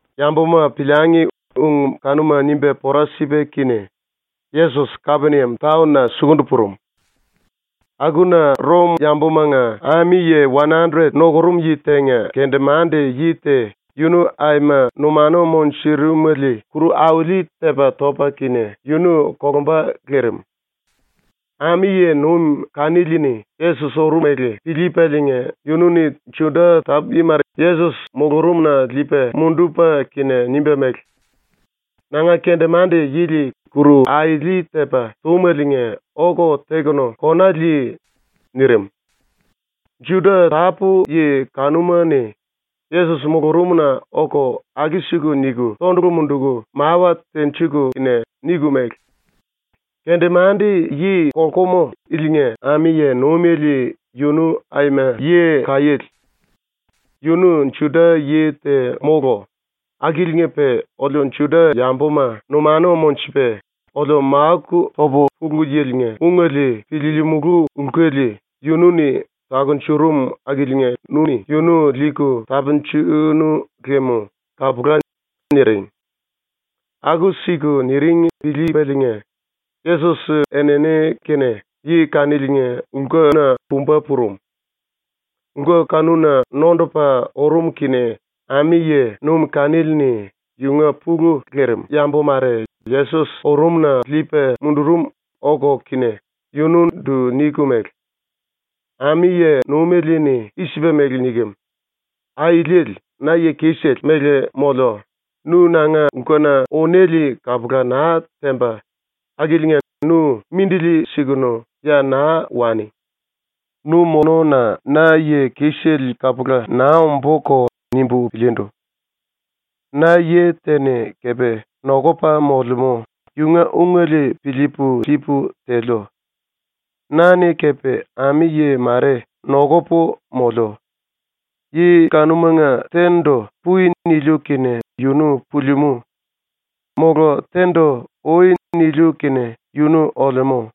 Yambuma piliangi ung kanuma nimba pora sipa kene Yesos Kapeniam taon-na sukundu purum. Akuna Rom-yambumanga ami-yi wan-andret nukurum yi tenga kendemande-yi te yunu aima numanu munjurumele kuru auli-tepa topa kene yunu kolumba lirim. Ami-yi nuim kanili-ni Yesos urumele piliipaliinga yunu-ni Juda tápu-yi mare Yesos mulurumna liipa mundupa kene nimba mele: “Nanga kendemande-yili ⸤kuru auli-tepa túmeliinga⸥ oku tekunu kona li.” nirim. Juda tápu-yi kanuma-ni Yesos mulurumna oku aku-siku niku tondulu munduku mawa tenjiku kene niku mele: “Kendemande-yi kolkumu ilinga ami-yi nuimele yunu aima yi kaiéle. ⸤Yunu Juda-yi te mólu⸥ akiliinga-pe oliu Juda-yambuma numanu monjupa, oliu máku topu Pulu Yili-nga ungele piliilimulu lkuli yunu-ni takunjurum akiliinga nu-ni yunu liiku tapunjunu lem kapula.” niring. Aku-siku niring piliipaliinga Yesos enini kene yi kaniliinga lkuna pumba purum. Lku kanuna nondupa urum kene ami-yi nuim kanili-ni yunga pulu lelemú yambu mare Yesos urumna liipa mundurum oku kene yunundu niku mele: “Ami-yi nuimele-ni i-sipa mele nikem: “Auliele, na yi kisele mele moliu, nu nanga lkuna unéle kapula naa temba akiliinga nu mindili sikunu ya naa wani. Nu molluna na yi kisele kapula naa ombúko nimbu piliindu. Na yi te-ni kepe nokupa molemú, yunga ungele piliipu liipu teliu. Na-ni kepe ami-yi mare nokupu moliu. Yi kanumanga te-ndu “Pui.” niliu kene yunu pulimú. Mola te-ndu “Ui.” niliu kene yunu olemú.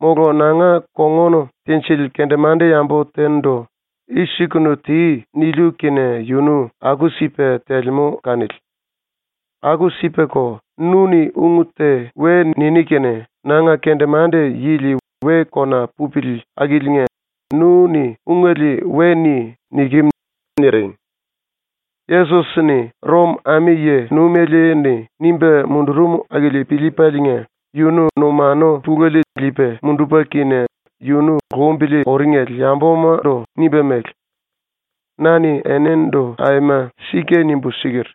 Mola nanga kongun tinjili kendemande-yambu te-ndu “I-sikunu ti.” niliu kene yunu aku-sipa telemú kanili. Aku-sipako, nu-ni ung te we niní kene nanga kendemande⸤-yi⸥li we kona pupili akiliinga nu-ni ungele we ni.” nikem.” niring. Yesos-ni Rom-ami yi-nuimele-ni nimba mundurum akili piliipaliinga yunu numanu pulele liipa mundupa kene yunu lumbili uringele yambumandu nimba mele: “Na-ni enindu aima sika nimbu siker: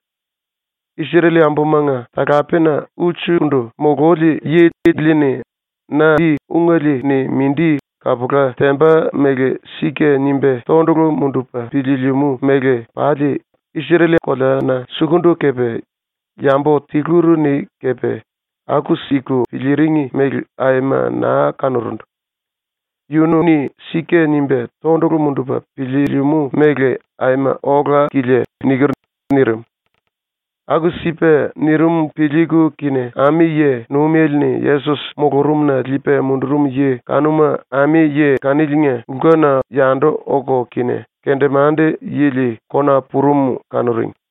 “Isrel-yambumanga talapena ulsukundu mululi yi ili-ni na ungele-ni mindi kapula temba mele “Sika” nimba tondulu mundupa piliilimú mele koleamanga pali, Isrel-koleana sukundu kepe, yambu tiluri-ni kepe aku-siku piliiring mele aima naa kanurundu. Yunu-ni ‘Sika’ nimba tondulu mundupa piliilimú mele aima ola-kilia.” niker.” nirim. Aku-sipa nirim piliiku kene ami-yi nuimele-ni Yesos mulurumna liipa mundurum yi kanuma ami-yi kaniliinga lkuna yandu oku kene kendemande-yili kona purum kanuring.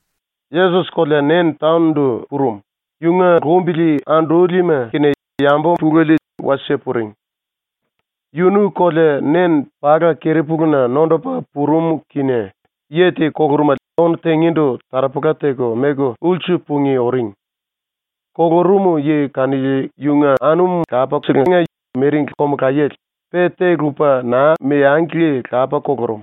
Yesos kolea Nen taon-ndu purum, yunga lumbili andúlima kene yambu pulele wasie puring. Yunu kolea Nen pala keri-puluna nondupa purum kene yi te kulurumele ónu tingíndu taropola teku meku ulsu pungí uring. Kulurum yi kanili yunga anum lapaselenga miringli komulayele, pe te lupa naa meangli lapa kulurum.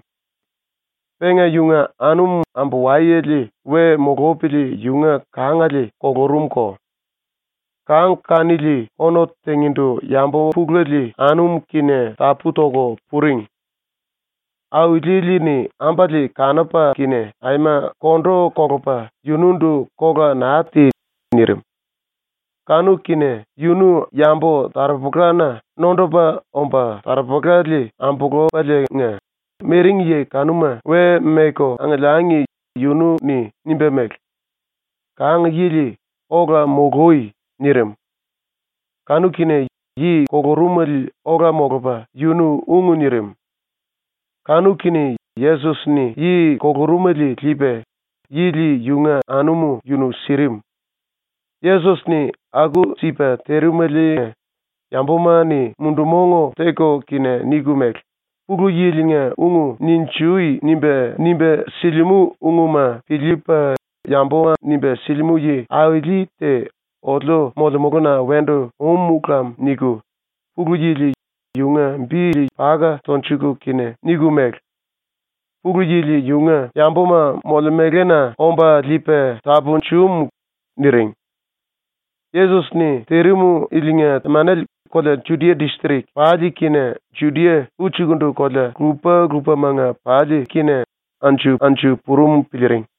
Penga yunga anum ambu-wayele we mulupili yunga kangale kulurumko. Kang kanili ónu tingíndu yambu pulele anum kene tapú toku puring. Auliele-ni ambale kanupa kene aima kondu kolupa yunundu “Kola naa ti.” nirim. Kanu-kene yunu yambu-taropolana nondupa omba taropolale ambulupaliinga, miring yi kanuma we meku angiliangi yunu-ni nimba mele: “Kang yili, ola mului.” nirim. Kanu-kene yi kulurumele ola molupa yunu ung nirim. Kanu-kene Yesos-ni yi kulurumele liipa yili yunga anum yunu sirim. Yesos-ni aku-sipa tirimeliinga yambuma-ni mundu-mong teku kene niku mele: “Pulu Yili-nga ung “Ninjui.” nimba, nimba silimú ungma piliipa yambuma nimba sili yi-auli te oliu molemuluna wendu um lam.” niku Pulu Yili yunga bili paka tonjuku kene niku mele: “Pulu Yili yunga yambuma molemelena omba liipa tapunjum.” niring. Yesos-ni tirim ilinga temanele kolea Judia distrik pali kene Judia ulsukundu kolea lupa-lupamanga pali anju-anju purum piliiring.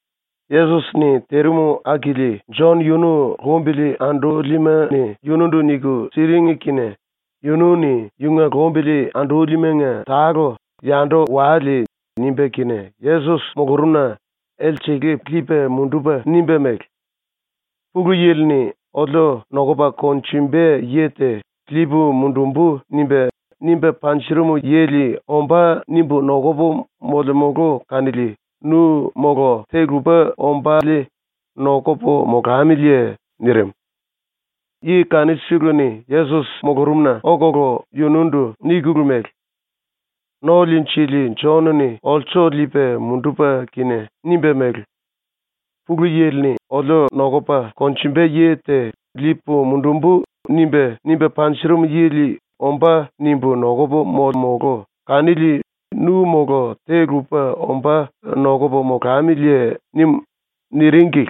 Yesos-ni tirim akili Jon yunu lumbili andúlima-ni yunundu niku siring kene yunu-ni yunga lumbili andúlimanga tale “Yandu wale.” nimba kene Yesos mulurumna elsele liipa mundupa nimba mele: “⸤Pulu Yili-ni oliu nokupa konjumba yi te⸥ “liipu mundumbu.” nimba, nimba panjurum yili ‘Ombá.’ nimbu nokupu molemulu kanili nu mola te lupa ombále nokupu molamiliye?” nirim. Yi kanusele-ni Yesos mulurumna okulu yunundu nikulu mele: “No-Liinjili Jon-ni olsu liipa mundupa kene nimba mele: “⸤Pulu Yili-ni oliu nokupa konjumba yi te⸥ “liipu mundumbu.” nimba, nimba panjurum yili ‘Ombá.’ nimbu nokupu molemulu kanili nu mola te-lupa ombá nokupu molamiliye?” nim.” niringli.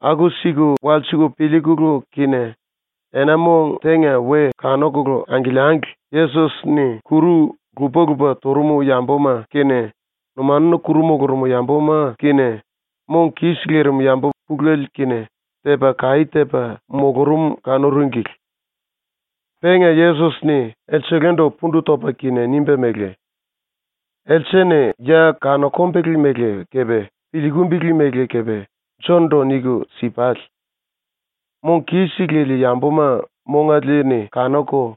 Aku-siku walsiku piliikulu kene ena-mong tenga ⸤we kanuku angiliangli⸥ Yesos-ni kuru lupa-lupa turum yambuma kene, numanuna kuru mulurum yambuma kene, mong kis lirim yambu pulele kene, tepa kaí tepa mulurum kanuringli. Penga Yesos-ni elselendu pundu topa kene nimba mele: “Else-ni ya kanokumbele mele kepe piliikimbili mele kepe Jon-ndu niku si-pale. Mong kis lili yambuma mongale-ni kanuku,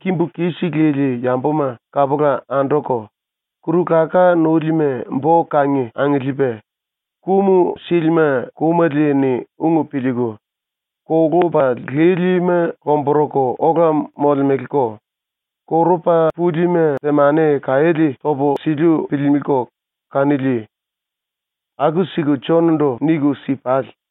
kimbu kis lili yambuma kapula anduku, kuru-laká núlima bo-kangi angiliipa, kum sílima kumele-ni ung piliiku, kolupa lílima lomburuku ola molemeleko, korupa púlima temani-kaiéle topu siliu piliilimiliko kanili. Aku-siku Jon-ndu niku si-pale.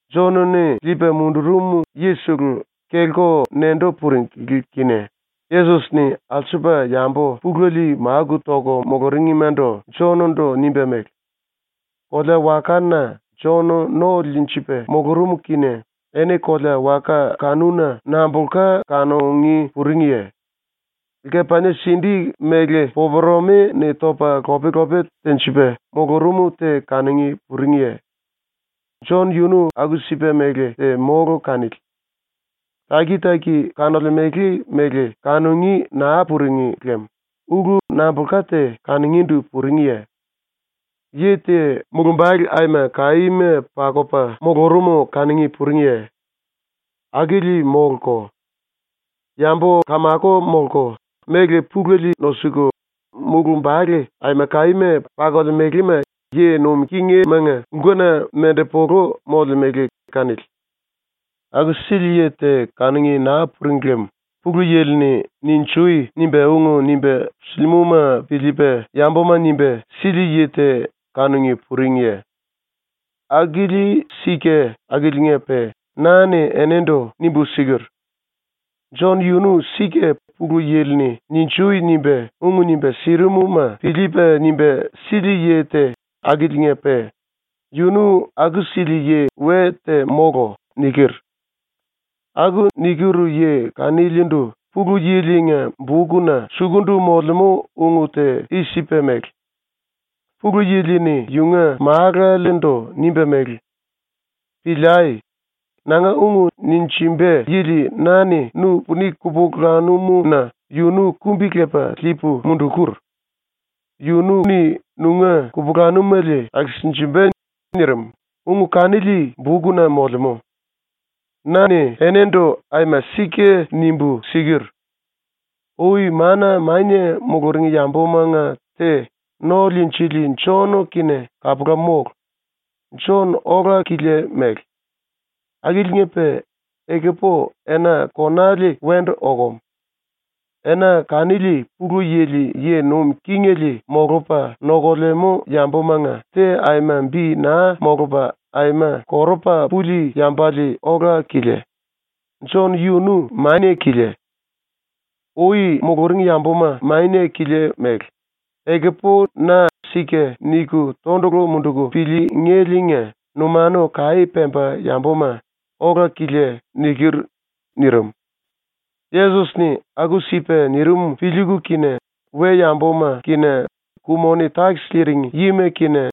Jon-ni liipa mundurum yisele kelku nendu puringli kene Yesos-ni alsupa yambu pulele máku toku muluringmandu Jon-ndu nimba mele: “⸤Kolea-wakana Jon no liinjipa mulurum kene⸥ eni kolea-waka kanuna nambulka kanungí puringiye? Lkepanie-sindí mele popuremi-ni topa lop-lope tenjipa mulurum te kanungí puringiye? ⸤Jon yunu aku-sipa mele te mólu kanili.⸥ ⸤Taki-taki kanolemele mele kanungí naa puring lem⸥ ulu nambulka te kanungíndu puringiye? Yi te mulumbale aima kaíma pakupa mulurum kanungí puringiye? Akili móluko. Yambu kamako molku, méle pulele nosuku, mulumbale aima kaíma pakolemelema yi nuim kingimanga lkuna mendepulu molemele kanili. “⸤Aku-sili yi te kanungí naa puring lem⸥ Pulu Yili-ni “Ninjui!” nimba ung nimba silimúma piliipa yambuma nimba sili yi te kanungí puringiye? Akili sika akiliinga-pe na-ni enindu nimbu siker: “Jon yunu sika Pulu Yili-ni “Ninjui!” nimba ung nimba sirimuma piliipa nimba sili yi te akiliinga-pe yunu aku-sili yi we te mólu.” niker. Aku niker yi kanilindu Pulu Yili-nga bukna sukundu molemú ung te i-sipa mele: ‘⸤Pulu Yili-ni yunga Málalendu nimba mele:⸥ “Piliai! Nanga ung ninjimba yili na-ni nu puni kupulanum-na yunu kumbi-lepu liipu mundukur. Yunu-ni nunga kupulanumele akisinjimba.” nirim.’ ung kanili bukna molemú. Na-ni enindu aima sika nimbu siker: “Ui mana mania muluring yambumanga te ⸤No-Liinjili⸥ Jon kene kapula mólu. Jon ola-kilia mele. Akiliinga-pe ekupu ena konale wendu okum. Ena kanili Pulu Yili yi nuim kingele molupa nokulemú yambumanga te aima bi naa molupa aima korupa puli yambale ola-kilia; Jon yunu mania-kilia. ⸤Ui muluring yambuma mania-kilia mele; ekupu na ‘Sika’ niku tondulu munduku piliingéliinga numanu kaí pemba yambuma ola-kilia.⸥” niker.” nirim. Yesos-ni aku-sipa nirim piliiku kene we-yambuma kene ku-moni-takis liiring yima kene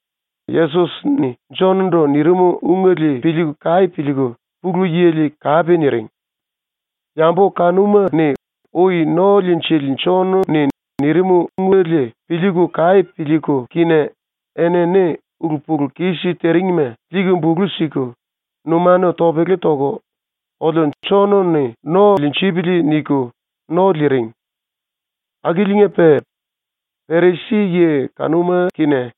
Yesos-ni Jon-ndu nirim ungele piliiku kaí piliiku Pulu Yili kape niring. Yambu kanuma-ni ui ⸤No-Liinjili⸥ Jon-ni nirim ungele piliiku kaí piliiku kene enini ulu-pulu-kis tiringma liiku bulu siku, numanu topele toku ‘Oliu Jon-ni no liinjipili.’ niku no liiring. Akiliinga-pe Perisi-yi kanuma kene,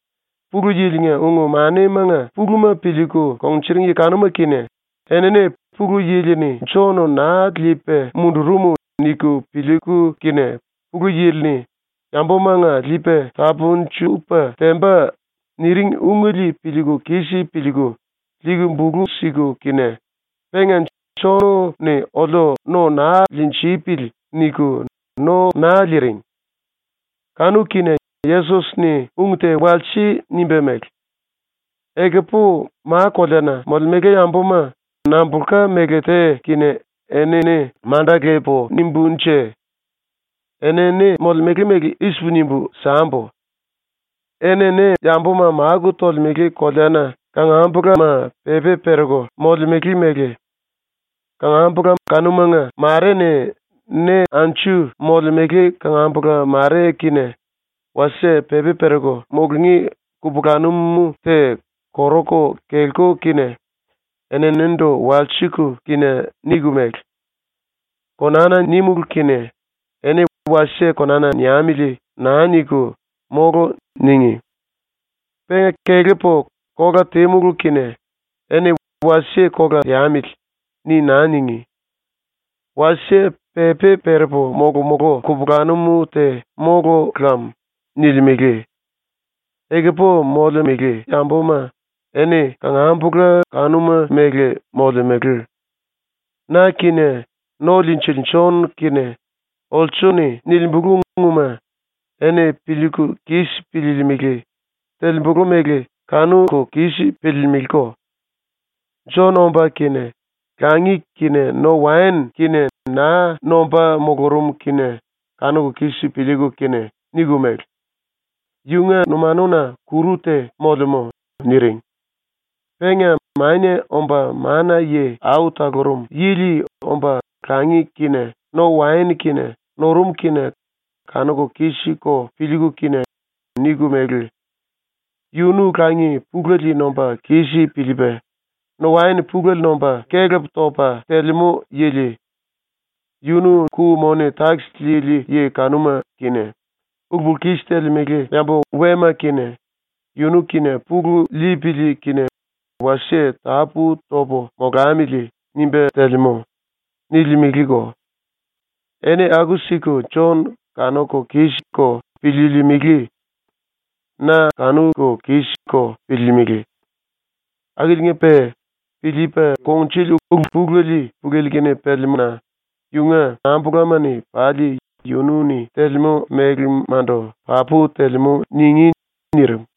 Pulu Yili-nga ung-manimanga puluma piliiku kungnjuring yi kanuma kene, enini ‘Pulu Yili-ni Jon naa liipa mundurum.’ niku piliiku kene, Pulu Yili-ni “Yambumanga liipu tapunjupu tembu.” nirim ungele piliiku kis piliiku liiku bulu siku kene penga ‘Jon-ni oliu no naa liinjipili.’ niku no naa liiring. Kanu-kene Yesos-ni ung te wasie nimba mele: “Ekupu ma-koleana molemele yambuma nambulka méle te kene enini manda lepu nimbúnje? ⸤Enini molemele mele i-sipu nimbu sambu:⸥ Enini yambuma máku tolemele koleana kangambulama pepi pereku molemele mele. Kangambula kanumanga mare-ni ne anju molemele kangambula mare ⸤kene wasie pepi pereku mulungí kupulanum te koruku kelku kene⸥ eninindu walsiku kene niku mele: “Konana nímulu kene eni ‘Wasie konana niamili.’ naa niku “Mólu.” níngi. Penga kelepu kola tímulu kene eni ‘Wasie kola teamili.’ ni naa níngi. ⸤Wasie pepi perepu molomulú kupulanum te mólu lam.⸥” nilimele. ⸤Ekupu molemele yambuma eni kangambula kanuma mele molemele.⸥ ⸤Na kene No-Liinjili Jon kene olsu-ni nilimbulu ungma eni piliiku kis piliilimili; telembulu mele kanuku kis piliilimiliko⸥. Jon omba kene langi kene no-waen kene naa nomba mulurum kene ⸤kanuku kis piliiku kene⸥ niku mele: “Yunga numanuna kuru te molemú.” niring. Penga Mania Omba Mana-Yi Au Talurum Yili omba langi kene no-waen kene nurum kene ⸤kanuku kis-ko piliiku kene⸥ niku mele: “Yunu langi pulele nomba kis piliipa, no-waen pulele nomba kelep topa telemú yili. Yunu ku-moni-takis liili yi kanuma kene, ulu-pulu-kis telemele yambu wema kene ‘Yunu kene pulu lipili kene wasie tapú topu molamili.’ nimba telemú.” nilimeleko. ⸤Eni aku-siku Jon kanuku kis-ko piliilimili. Na kanuku kis-ko piliilimili.⸥ Akiliinga-pe piliipa kungnjuli ulu-pulele Pulu Yili-kene pelemú-na yunga kangambulama-ni pali yunu-ni telemú melemandu ‘Papu telemú.’ ningí.” nirim.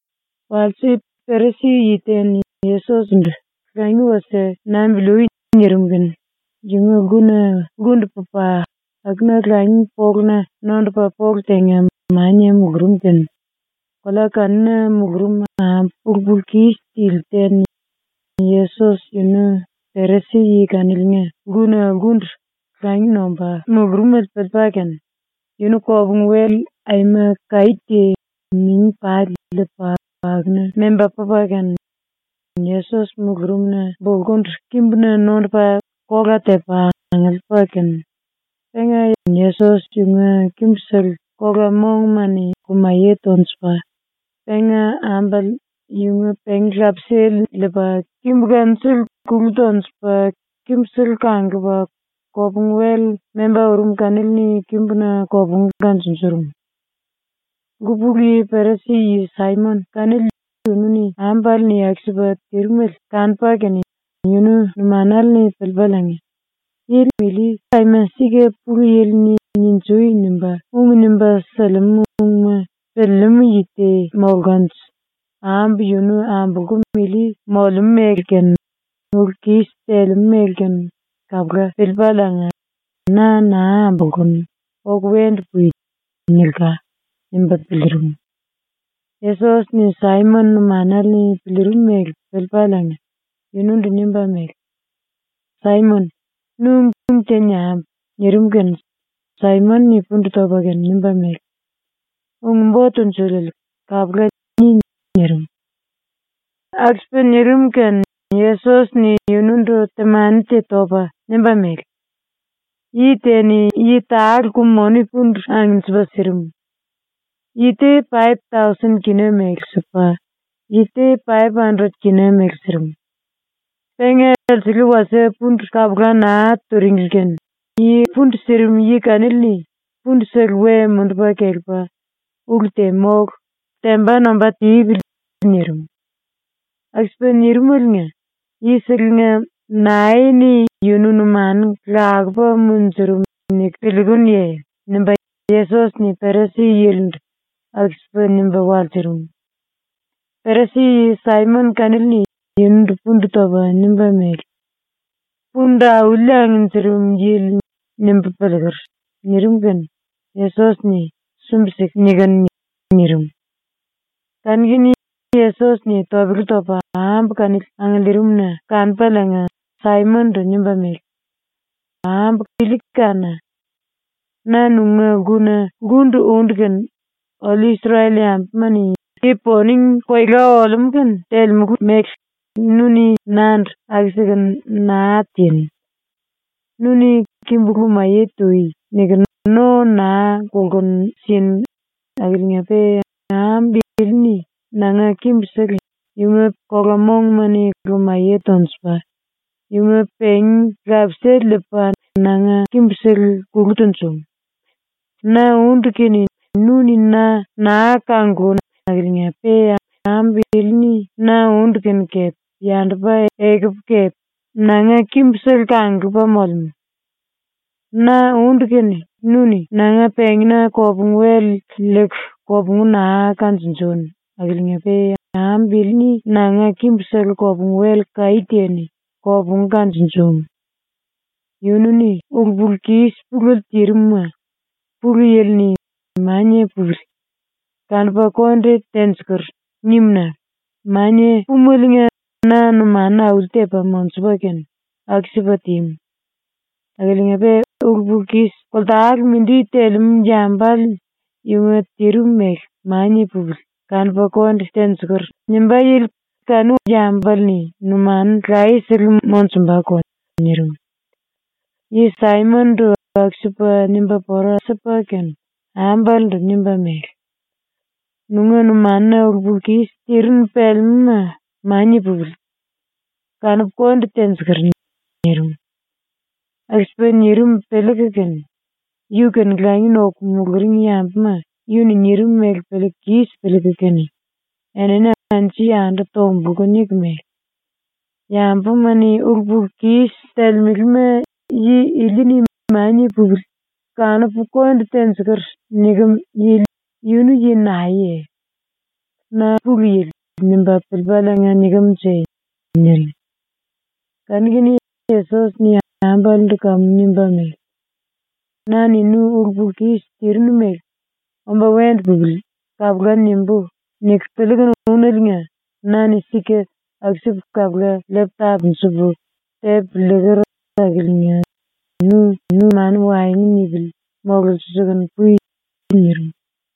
Walse, Perisi-yi te-ni Yesos-ndu “Langi wasie nambili ui.” nirim kene yunga lkuna lkundu pupa akuna langi poluna nondupa polu tenga mania mulurum kene kolea kanuna mulurum ambu ulu-pulu-kis tili te-ni Yesos yunu Perisi-yi kaniliinga lkuna lkundu langi nomba mulurumele piliipa kene, yunu kopungu-wel aima kaí te mingi pali liipa akuna memba pupa kene Yesos mulurumna bulkundu kimbuna nondupa kola tepa angiliipa kene, penga Yesos yunga kimbusele kola-monguma-ni lumaye tonjupa, penga ambale yunga pengi-lapisale liipa kimbu kanusele kulu tonjupa, kimbusele kanglupa, kopungu-wel memba urum kanili-ni kimbuna kopungu kanjunjurum. Lku pulu yi Perisi-yi ⸤Saimon⸥ kanili yunu-ni ambale-ni aku-sipa tirimele kanupa kene yunu numanale-ni piliipaliinga ‘Yi ili aima sika Pulu Yili-ni “Ninjui!” nimba ung nimba silimú ungma piliilimú yi te molkanje ambu yunu ambulkum ili molemú mele kene ulu-kis telemú mele kene kapula piliipaliinga “Na naa ambolkunu, oku wendu pui.” nilka.’ nimba piliirim. Yesos-ni ⸤Saimon⸥ numanale-ni piliirim mele piliipaliinga yunundu nimba mele: “Saimon, nu ung te niambu.” nirim kene Saimon-ni pundu topa kene nimba mele: “Ung-Bo Tunjuliele, kapula, ni.” nirim. ⸤Aku-sipa nirim kene Yesos-ni yunundu temani te topa nimba mele:⸥ “Yi te-ni yi tale ku-moni pundu angnjipa sirim. Yi te paip-tausen kina mele sipa, yi te paip-anderet kina mele sirim. Penga elsele wasie pundu kapula naa tunjuringli kene yi pundu sirim yi kanili-ni pundusele we mundupa kelepa “Ulu te mólu. Temba nomba tipili.” nirim. Aku-sipa nirimaliinga yiselenga nae-ni yunu numanu lakupa munjurum niku piliikunuye?” nimba Yesos-ni Perisi-yilindu aku-sipa nimba walsurum. ⸤Perisi-yi⸥ Saimon kanili-ni yunundu pundu topa nimba mele: “Pundu auli angnjirim yili, nimbu piliiker.” nirim kene Yesos-ni “Sumbi-siku nikinu.” nirim. Kanu-kene Yesos-ni topele topa ambu kanili angiliirimna kanupaliinga Saimon-ndu nimba mele: “Ambu ili kána! Na nunga lkuna lkundu úndu kene ⸤oliu Isrel-yambuma-ni yi-poning koela olemú kene telemulu mele⸥ nu-ni nandu aku-sikunu naa tinu. Nu-ni “Kimbu lumaye tui.” niku no naa kulkunu sinu akiliinga-pe ambu ili-ni nanga kimbusele yunga kola-monguma-ni lumaye tonjupa, yunga pengi-lapisale liipa nanga kimbusele kulu tunjum. Na úndu kene nu-ni na naa kanglunu akiliinga-pe ambu ili-ni na úndu kene kepe yandupa ekupu kepe nanga kimbusele kanglupa molemú. Na úndu kene nu-ni nanga pengína kopungu-wel liiku kopungu naa kanjunjunu akiliinga-pe ambu ili-ni nanga kimbusele kopungu-wel kaí te-ni kopungu kanjunjumu. Yunu-ni ulu-pulu-kis pulele tirim-ma ⸤Pulu Yili-ni⸥ “Mania pupili. Kanupu konde tenjikur.” nimu-na mania púmeliinga na numanu auli-tepa monjupa kene aku-sipa tímu. Akiliinga-pe ulu-pulu-kis koltale mindi telemú yambale yunga tirim mele ‘Mania pupili, kanupu konde tenjikur.’ nimbá yili kanu yambale-ni numanu layesele monjumbako.” nirim. Yi Saimon-ndu aku-sipa nimba pora sipa kene ambalendu nimba mele: “Nunga numanuna ulu-pulu-kis tirinu pelemúma mania pupili, kanupu konde tenjikur.” nirim. Aku-sipa nirim piliiku kene yu-kene langi noku muluring yambuma yunu-ni nirim mele piliiku kis piliiku kene enini anju-yandu tombulku niku mele: “Yambuma-ni ulu-pulu-kis telemelema yi ili-ni “Mania pupili, kanupu konde tenjikur.” nikem yili yunu yi naeye? ⸤‘Na Pulu Yili.’ nimba piliipaliinga nikem-nje?⸥” niring. Kanu-kene Yesos-ni ambalendu kamu nimba mele: “Na-ni nu ulu-pulu-kis tirinu mele ‘ ‘Omba wendu pupili.’ kapula nimbú.’ niku piliikunu úneliinga na-ni sika aku-sipu kapula liipu tapunjupu tepu liiker akiliinga nu numanu waengu nipili mololsiliikunu pui.” nirim.